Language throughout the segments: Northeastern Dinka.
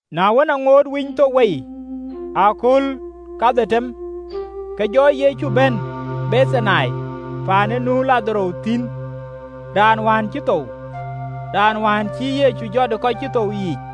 Na wën, aŋoot Winythok wei ë akööl kadhetem, ke Yecu jɔ bɛ̈n Bethani, paan ë nu Ladharo thïn, raan wään cï thou, raan wään cïï Yecu jɔt ë kɔc cï thou yiic.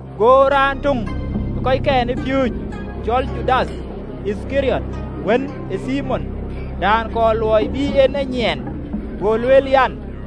Go raan töŋ ë kɔckɛn ë piööcë, cɔl Judath Yithkariɔt, wën ë Thimon, raan kɔɔr luɔi bï en e nyiɛɛn, go lueel an,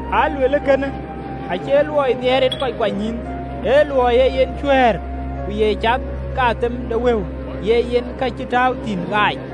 Aa lueel kënë, acie luɔi nhiɛɛr en kɔc kuanynyïïn, ee luɔi ee yen cuɛ̈ɛ̈r, ku ye cath ke athep de wëu, ye yen ka cï tääu thïn ɣääc.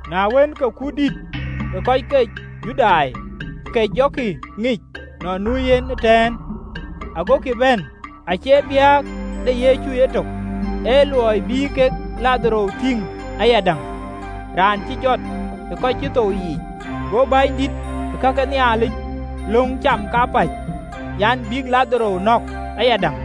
Na wën, ke kut dïït ë kɔc ke Judai ke jɔkï ŋic nɔn nu yen ëtɛ̈ɛ̈n: agokï bɛ̈n, acie biäk de Yecu ëtök, ee luɔi bï kek Ladharo tïŋ ayadäŋ, raan cï jɔt ë kɔc cï thou yiic. Go bänydït ke ka ke Nhialic löŋ cam kapäc an, bïk Ladharo nɔ̈k ayadäŋ,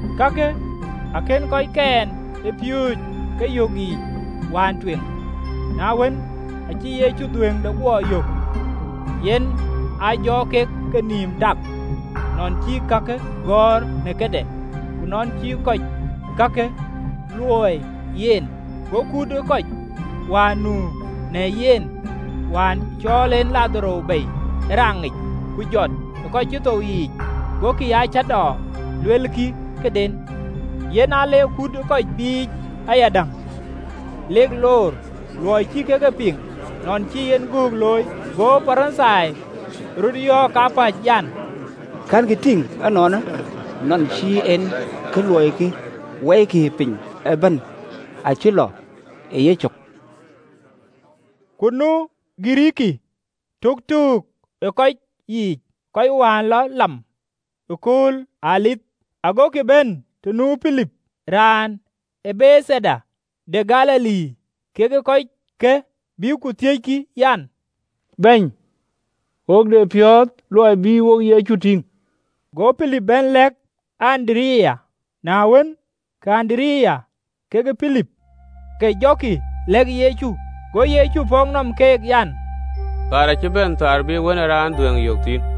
Kakë akënë kɔckɛn ë piööcë ke yök yiic wään tueŋ: na wën, acï Yecu dhuëëŋde guɔ yök, yen aa jɔ kek kenïïm tak, nɔn cï kakë gɔ̈ɔ̈r në këde, ku nɔn cï kɔc kakë luöi yen. Go kut ë kɔc wään nu në yen, wään cɔɔl en Ladharo bei ë raŋic, ku jɔt ë kɔc cï thou yiic, gokï aa cäätɔɔ luelkï këden. Yen aa le kut ë kɔc biic ayadäŋ, lek loor, luɔi cï kek e piŋ nɔn cï en gökë looi. Go Parithai röt yɔ̈ɔ̈k kapäc an, “Kɛ̈nkï tïŋ ënɔɔnë, nɔn cï en kë luɛlkï? Wɔikï, piny ëbɛ̈n acï lɔ ë yecök!” Ku nu Girikii töktöök ë kɔc yiic, kɔc wään lɔ lam ëkööl ë Dhuëëŋ: Agokï bɛ̈n të nu Pilip, raan ë Bethaida de Galili, kek kɔckë, bïk ku thiëckï an, “Bɛ̈ny, wo de piɔ̈ɔ̈th luɔi bï wo Yecu tïŋ.” Go pilip bɛ̈n lɛ̈k Andereya: na wën, ke Andereya kekë Pilip ke jɔkï lɛ̈k Yecu. Go Yecu pɔ̈k nɔm keek an, “Kööl acï bɛ̈n kööl bï Wën ë Raan dhuëëŋ yök thïn.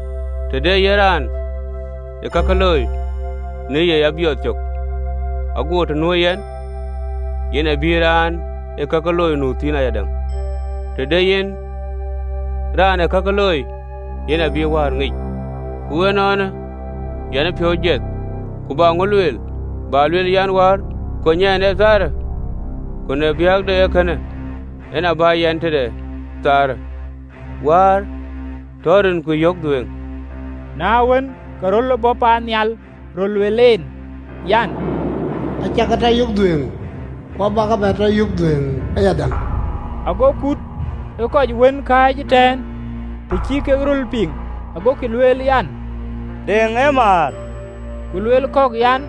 Të de yen raan ë kakï looi, në ye ya biɔɔth cök, ago bɛ̈n të nuö yɛn, yen abï raan ee kakï looi nu thïn ayadäŋ: të de yen raan ee kakï looi, yen abï Wäär ŋic. “Ku ënɔɔnë yɛn ë piɔ̈u jiɛth, ku bä ŋö lueel? Bä lueel an, Wäär kony ɛn ee köölë? Ku në biäk de ee kënë, en aa bä yɛn, aguɔ tëëk në nuan ee köölë yic. Wäär, tɔ rinku yök dhuëëŋ!” Na wën, ke röl bɔ̈ paannhial röl luel en an, “Acä ke tɔ yök dhuëëŋ, ku abä ke bɛ tɔ yök dhuëëŋ ayadäŋ.” Ago kut ë kɔc wën kääc ëtɛ̈ɛ̈n, të cï kek röl piŋ, agokï lueel an, deŋ ë määr: ku lueel kɔ̈k an,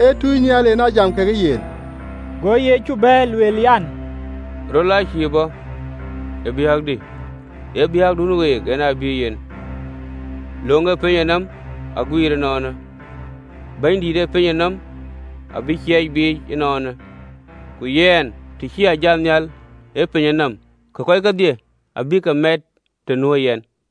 “Ee tunynhial en aa jam kekë yen!” Go Yecu bɛ̈ɛ̈r, luel, an, “Rölë aa cïï bɔ̈ ë biäkdï, ee biäkdun week, en ë bï yen. Löŋ ë pinyë nɔm aguiir ënɔɔnë: bɛ̈nydït ë pinyë nɔm abï ciɛɛc biic ënɔɔnë. Ku yɛn, të cï a jat nhial ë piny nɔm, kɔc kedhie abä ke miɛɛt të nuö yɛn.”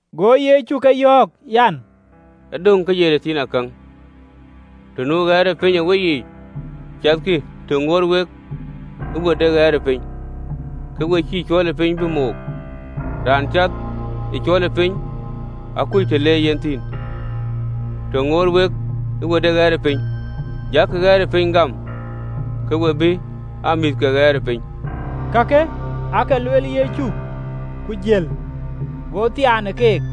Go Yecu ke yɔ̈ɔ̈k an, “E döŋ ke ye tëthiinakäŋ, të nu ɣɛɛrëpiny ë weyiic. Cathkï të ŋuɔɔt wek ë we de ɣɛɛrëpiny, ke we cïï cuɔlëpiny bï mook: raan cath ë cuɔlëpiny akuc të le yen thïn. Të ŋuɔɔt wek ë we de ɣɛɛrëpiny, jakï ɣɛɛrëpiny gam, ke we bï aa mïth ke ɣɛɛrëpiny.” Ciën Gäm de Kɔc Kakë aake lueel Yecu, ku jiël, go thiaan ë keek.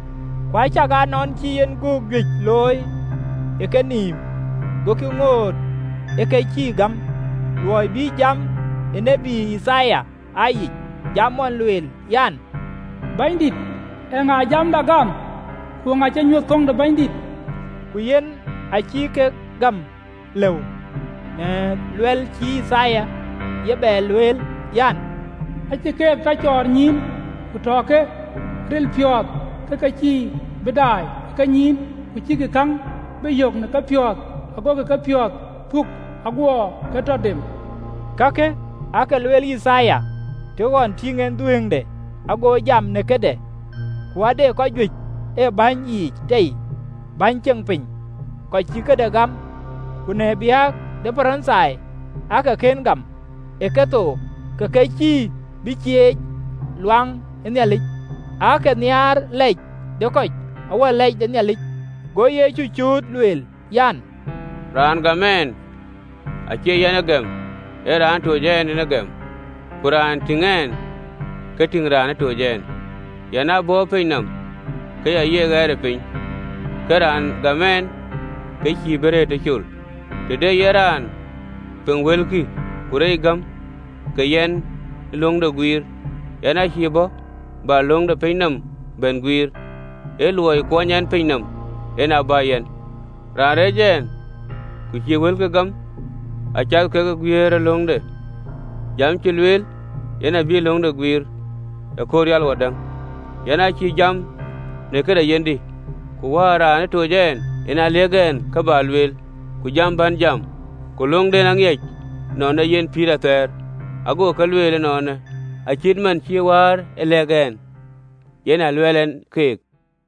Ku acakaa nɔn cï en göök juëc looi ë kenïïm, gokï ŋoot ë ke cïï gam: (LXX). luɔi bï jam ë tiët Yithaya aa yic, jam ɣɔn lueel an, “Bɛ̈nydït, eeŋa ë jamda gam? Ku eeŋa cï nyuöth köŋ de Bɛ̈nydït?” Ku yen aacïï kek gäm lëu, në luɛl cï Yithaya ye bɛ lueel an, (LXX). “Acï keek tɔ cɔɔr nyïïn, ku tɔ ke ril piɔ̈ɔ̈th, Ke ke cïï bï daai ë kenyïïn, ku cïkï käŋ bï yök ë kepiɔ̈ɔ̈th, Agokï kepiɔ̈ɔ̈th puk, Aguɔ ke tɔ dem. Kakë aake lueel Yithaya, të ɣɔn tïŋ en dhuëëŋde, ago jam në këde. Ku aa de kɔc juëc ë bäny yiic tei, bäny ceŋ piny, kɔc cï këde gam, ku në biäk de Parithai aake kën gam ë kethook, ke ke cïï bï cieec ɣön ë Nhialic: aake nhiaar lɛc de kɔc awär lɛc de Nhialic. Go Yecu cööt, lueel an, “Raan gam ɛn, acie yɛn ë gɛm, ee raan ë toc ɛn en a gɛm. Ku raan tïŋ ɛn, ka tïŋ raan ë toc ɛn. Yɛn aa bɔ̈ ë piny nɔm, ke ya ye ɣɛɛrëpiny, ke raan gam ɛn, ke cïï bï rëër tëcol. Të de yen raan piŋ wëlkï, ku reec gam, ka yɛn cïï löŋde guiir: yɛn aacïï bɔ̈ bä löŋ de piny nɔm bɛ̈n guiir, ee luɔi kuɔny ɛn piny nɔm, en aa bä yɛn. Raan reec ɛn, ku cïï wëlkï gam, acath ke raan bï löŋde guiir: jam cä lueel, yen abï löŋde guiir ëkööl rial wadäŋ. Yɛn acïï jam në këde yenhdï, ku Wäär raan ë toc ɛn, yen aa lëk ɛn kë bä lueel, ku jam bän jam. Ku löŋde aŋiɛc nɔn ee yen pïïr athɛɛr: ago ka luɛɛl ënɔɔnë, acït man cï Wäär e lɛ̈k ɛn, yen aa luɛɛl ɛn keek.”